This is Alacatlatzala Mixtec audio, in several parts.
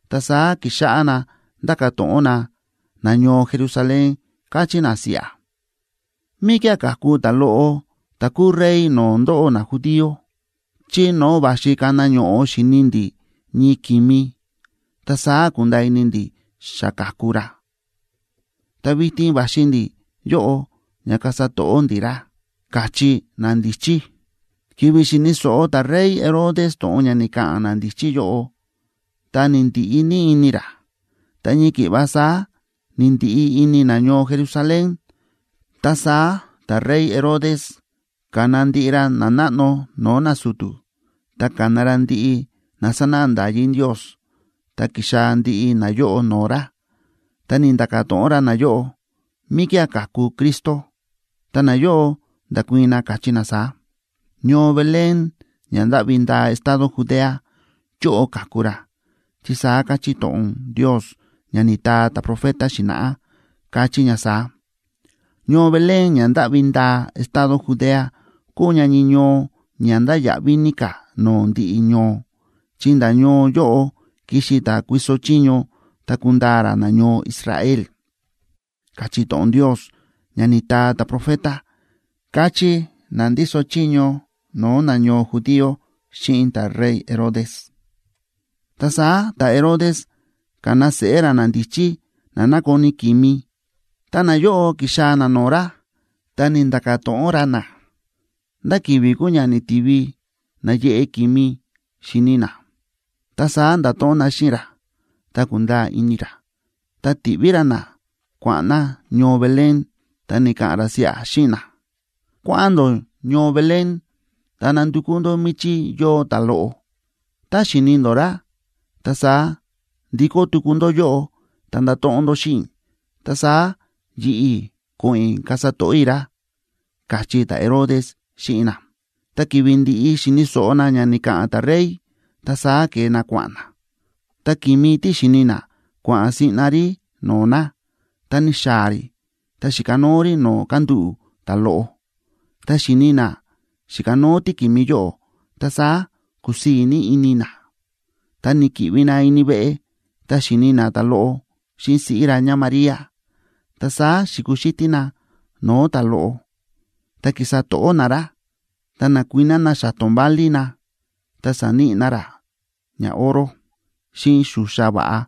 Ta saá ki̱xáꞌá na ndáka̱ to̱ꞌon na nañoo Jerusalén, káchí na siꞌa: ―¿Míkía̱ ka̱ku ta̱loꞌo ta̱ kuu rey no̱o̱ ndóꞌó najudío?a Chí no̱o̱ va̱xi kana ño̱ꞌo xi̱ni ndi̱ ñii ki̱mi, ta saá ku̱nda̱a̱ ini ndi̱ xa ka̱ku ra, ta vitin va̱xi ndi̱ yóꞌo ña kasa to̱ꞌó ndi̱ ra ―káchí nandíchí. Ki̱vi̱ xi̱ni̱ so̱ꞌo ta̱rey Herodes to̱ꞌon ña ni̱ka̱ꞌa̱n nandíchí yóꞌo, ta ni̱ndiꞌi ní ini ra. Ta ñii ki̱ꞌva saá ni̱ndiꞌi ini nañoo Jerusalén. Ta saá ta̱rey Herodes ka̱na ndiꞌi ra nanáꞌno no̱o̱ nasu̱tu̱, ta ka̱na ra ndiꞌi na sánáꞌa nda̱yí Ndios, ta ki̱xaa̱ ndiꞌi nayóꞌo no̱o̱ ra. Ta ni̱nda̱ka̱ to̱ꞌon ra nayóꞌo, míkía̱ kaku Cristo. Ta nayóꞌo nda̱kuii̱n na, káchí na saá: ―Ñoo Belén ña ndáꞌvi ndaa estado Judea yóꞌo kaku ra, chi saá káchí to̱ꞌon Ndios ña ni̱taa ta̱profeta xi̱na̱ꞌá, káchí ña saá: Ñoo Belén, ña ndáꞌvi ndaa estado Judea, kúu ña ñii ñoo ña ndáya̱ꞌví ní ka̱ no̱o̱ ndiꞌi ñoo; chi nda̱ ñoo yóꞌo kixi ta̱ kuiso chiño, ta kundaa ra nañoo Israel, káchí to̱ꞌon Ndios ña ni̱taa ta̱profeta ―káchí na ndíso chiño no̱o̱ nañoo judío xíꞌin ta̱rey Herodes. Ta saá ta̱Herodes ka̱na seꞌé ra nandíchí na nákoni ki̱mi, ta nayóꞌo ki̱xaa̱ na no̱o̱ ra, ta ni̱nda̱ka̱ to̱ꞌon ra na, ndá ki̱vi̱ kúu ña ni̱tivi na̱yeꞌe ki̱mi xi̱ni na. Ta saá nda̱to̱ꞌon na xíꞌin ra, ta ku̱nda̱a̱ ini ra. Ta ti̱ꞌví ra na kua̱ꞌa̱n na ñoo Belén, ta ni̱ka̱ꞌa̱n ra siꞌa xíꞌin na: ―Kua̱ꞌa̱n ndó ñoo Belén, ta nandukú ndó míchí yóo ta̱loꞌo. Tá xi̱ni ndó ra, ta saá ndikó tuku ndó yóꞌo ta ndato̱ꞌon ndó xíꞌin i̱, ta saá yi̱ꞌi̱ ko̱ꞌo̱n i̱ kasa to̱ꞌó i̱ ra ―káchí ta̱Herodes xíꞌin na. Ta ki̱vi̱ ndi̱ꞌi xi̱ni̱ so̱ꞌo na ña ni̱ka̱ꞌa̱n ta̱rey, ta saá ke̱e na kua̱ꞌa̱n na. Ta ki̱mi tí xi̱ni na, kua̱ꞌa̱n siꞌna rí no̱o̱ na, ta ni̱xaa̱ rí ta xi̱kanóo rí no̱o̱ kándúꞌu̱ ta̱loꞌo. Tá xi̱ni na xi̱kanóo tíki̱mi yóꞌo, ta saá ku̱sii̱ ní ini na. Ta ni̱ki̱ꞌvi na ini veꞌe, ta xi̱ni na ta̱loꞌo xíꞌin siꞌí ra ñáMaría. Ta saá xi̱kuxítí na no̱o̱ ta̱loꞌo, ta ki̱sa to̱ꞌó na ra. Ta na̱kuiná na xa̱to̱n válí na, ta sa̱níꞌi na ra ñaoro, xíꞌin xuxa va̱ꞌa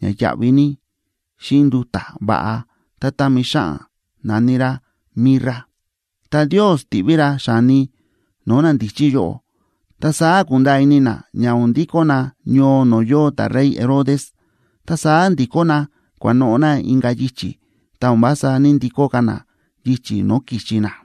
ña yáꞌví ní, xíꞌin nduta̱ va̱ꞌa tá támi xáꞌan na̱ní rá mirra. Ta Ndios ti̱ꞌví ra xa̱ni no̱o̱ nandíchí yóꞌo, ta saá ku̱nda̱a̱ ini na ña o̱n ndikó na ñoo no̱o̱ yóo ta̱rey Herodes. Ta saá ndi̱kó na kua̱noꞌo̱ na inka̱ yichi̱, ta o̱n vása ní‑ndikó ka̱ na yichi̱ no̱o̱ ki̱xi na.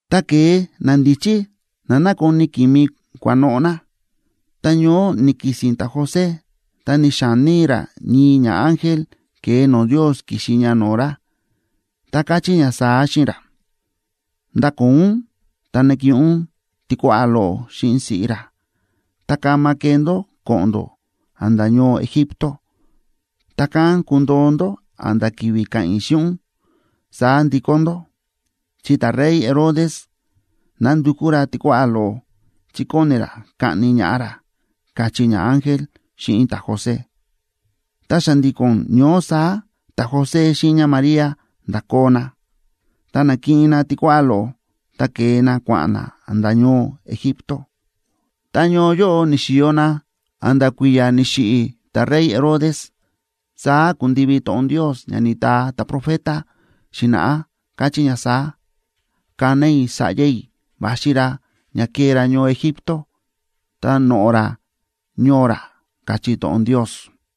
Tá ke̱e nandíchí na nákoni ki̱mi kua̱noꞌo̱ na, ta ñoó ni̱ki̱si̱n ta̱José ta ni̱xa̱ní ra ñii ñaángel ke̱e no̱o̱ Ndios ki̱xi ña no̱o̱ ra, ta káchí ña saá xíꞌin ra: ―Ndakoo ún, ta nakiꞌin ún tikuáꞌá loꞌo xíꞌin siꞌí ra, ta kama kee ndó ko̱ꞌo̱n ndó a̱nda̱ ñoo Egipto, ta kán kundoo ndó a̱nda̱ ki̱vi̱ ka̱ꞌa̱n i̱ xíꞌin ún, saá ndikó ndó. Chi ta̱rey Herodes nandukú ra tikuáꞌá loꞌo, chi kóni ra kaꞌni ñaꞌá ra ―káchí ñaángel xíꞌin ta̱José. Ta xa̱ndi̱ko̱n ñoó saá ta̱José xíꞌin ñáMaría nda̱koo na, ta na̱kiꞌin na tikuáꞌá loꞌo, ta ke̱e na kua̱ꞌa̱n na a̱nda̱ ñoo Egipto. Ta ñoo yóꞌo ni̱xi̱yo na a̱nda̱ kui̱ya̱ ni̱xiꞌi̱ ta̱rey Herodes. Saá ku̱ndivi to̱ꞌon Ndios ña ni̱taa ta̱profeta xi̱na̱ꞌá, káchí ña saá: “Ka̱na i̱ sa̱ꞌya i̱ va̱xi ra ña kee ra ñoo Egipto, ta noꞌo̱ ra ñoo ra”, káchí to̱ꞌon Ndios.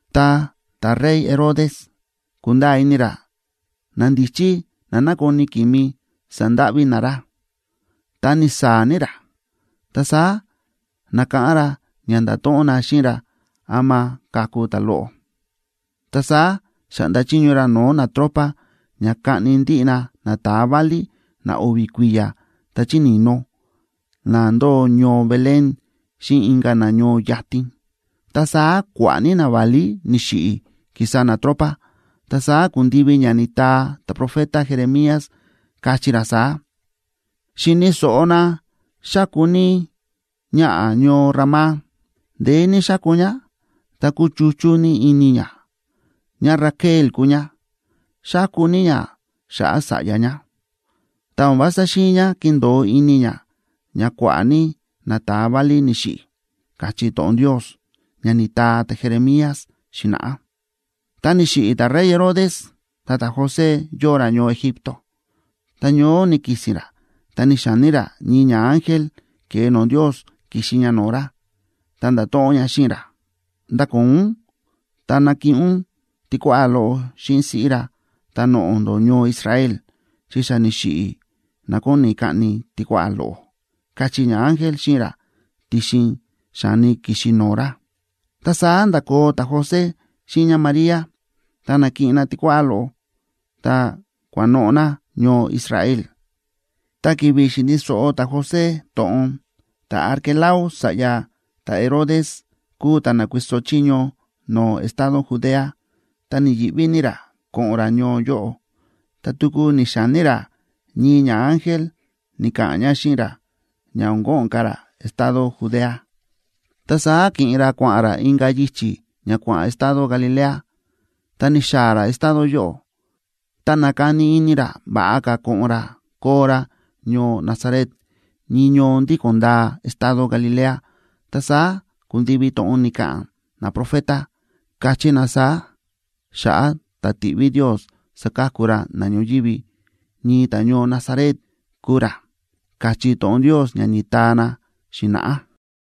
Tá ta̱rey Herodes ku̱nda̱a̱ ini ra nandíchí na nákoni ki̱mi sa̱ndáꞌví na ra, ta ni̱saa̱ ní ra. Ta saá na̱káꞌán ra ña nda̱to̱ꞌon na xíꞌin ra ama ka̱ku ta̱loꞌo. Ta saá xa̱ꞌnda chiño ra no̱o̱ natropa ña kaꞌni ndiꞌi na nata̱a válí na o̱vi̱ kui̱ya̱ ta chí ni̱no̱ na ndóo ñoo Belén xíꞌin inka̱ na ñoo yatin. Ta saá kua̱ꞌa̱ ní naválí ni̱xiꞌi̱, ki̱sa natropa. Ta saá ku̱ndivi ña ni̱taa ta̱profeta Jeremías, káchí ra saá: Xi̱ni̱ so̱ꞌo na xáku ní ñaꞌa̱ ñoo Ramá, ndeé ní xáku ñá, ta kúchuchú ní ini ñá; ñáRaquel kúu ñá, xáku ní ñá xa̱ꞌa̱ sa̱ꞌya ñá, ta o̱n vása xi̱in ñá kindo̱o ini ñá ña kua̱ꞌa̱ ní nata̱a válí ni̱xiꞌi̱, káchí to̱ꞌon Ndios, ña ni̱taa ta̱Jeremías xi̱na̱ꞌá. Ta ni̱xiꞌi̱ ta̱rey Herodes, ta ta̱José yóo ra ñoo Egipto, ta ñoó ni̱ki̱si̱n ra ta ni̱xa̱ní ra ñii ñaángel ke̱e no̱o̱ Ndios ki̱xi ña no̱o̱ ra, ta nda̱to̱ꞌon ña xíꞌin ra: ―Ndakoo ún, ta nakiꞌin ún tikuáꞌá loꞌo xíꞌin siꞌí ra, ta noꞌo̱ ndó ñoo Israel, chi xa ni̱xiꞌi̱ na kóni kaꞌni tikuáꞌá loꞌo ―káchí ñaángel xíꞌin ra, ti̱xin xa̱ni ki̱xi no̱o̱ ra. Ta saá nda̱koo ta̱José xíꞌin ñáMaría, ta na̱kiꞌin na tikuáꞌá loꞌo, ta kua̱noꞌo̱ na ñoo Israel. Ta ki̱vi̱ xi̱ni̱ so̱ꞌo ta̱José to̱ꞌon ta̱Arquelao sa̱ꞌya ta̱Herodes kúu ta̱ na̱kuiso chiño no̱o̱ estado Judea, ta ni̱yi̱ꞌví ní ra ko̱ꞌo̱n ra ñoo yóꞌo. Ta tuku ni̱xa̱ní ra ñii ñaángel ni̱ka̱ꞌa̱n ña xíꞌin ra, ña o̱n ko̱ꞌo̱n ka̱ ra estado Judea, ta saá ki̱ꞌin ra kua̱ꞌa̱n ra inka̱ yichi̱ ña kua̱ꞌa̱n estado Galilea. Ta ni̱xaa̱ ra estado yóꞌo, ta na̱kani ini ra va̱ꞌa ka̱ ko̱ꞌo̱n ra koo ra ñoo Nazaret, ñii ñoo ndíko̱n ndaa estado Galilea. Ta saá ku̱ndivi to̱ꞌon ni̱ka̱ꞌa̱n naprofeta, káchí na saá xa̱ꞌa̱ ta̱ tiꞌví Ndios saka̱ku ra na ñoyívi: “Ñii ta̱ñoo Nazaret kuu ra”, káchí to̱ꞌon Ndios ña ni̱taa na xi̱na̱ꞌá.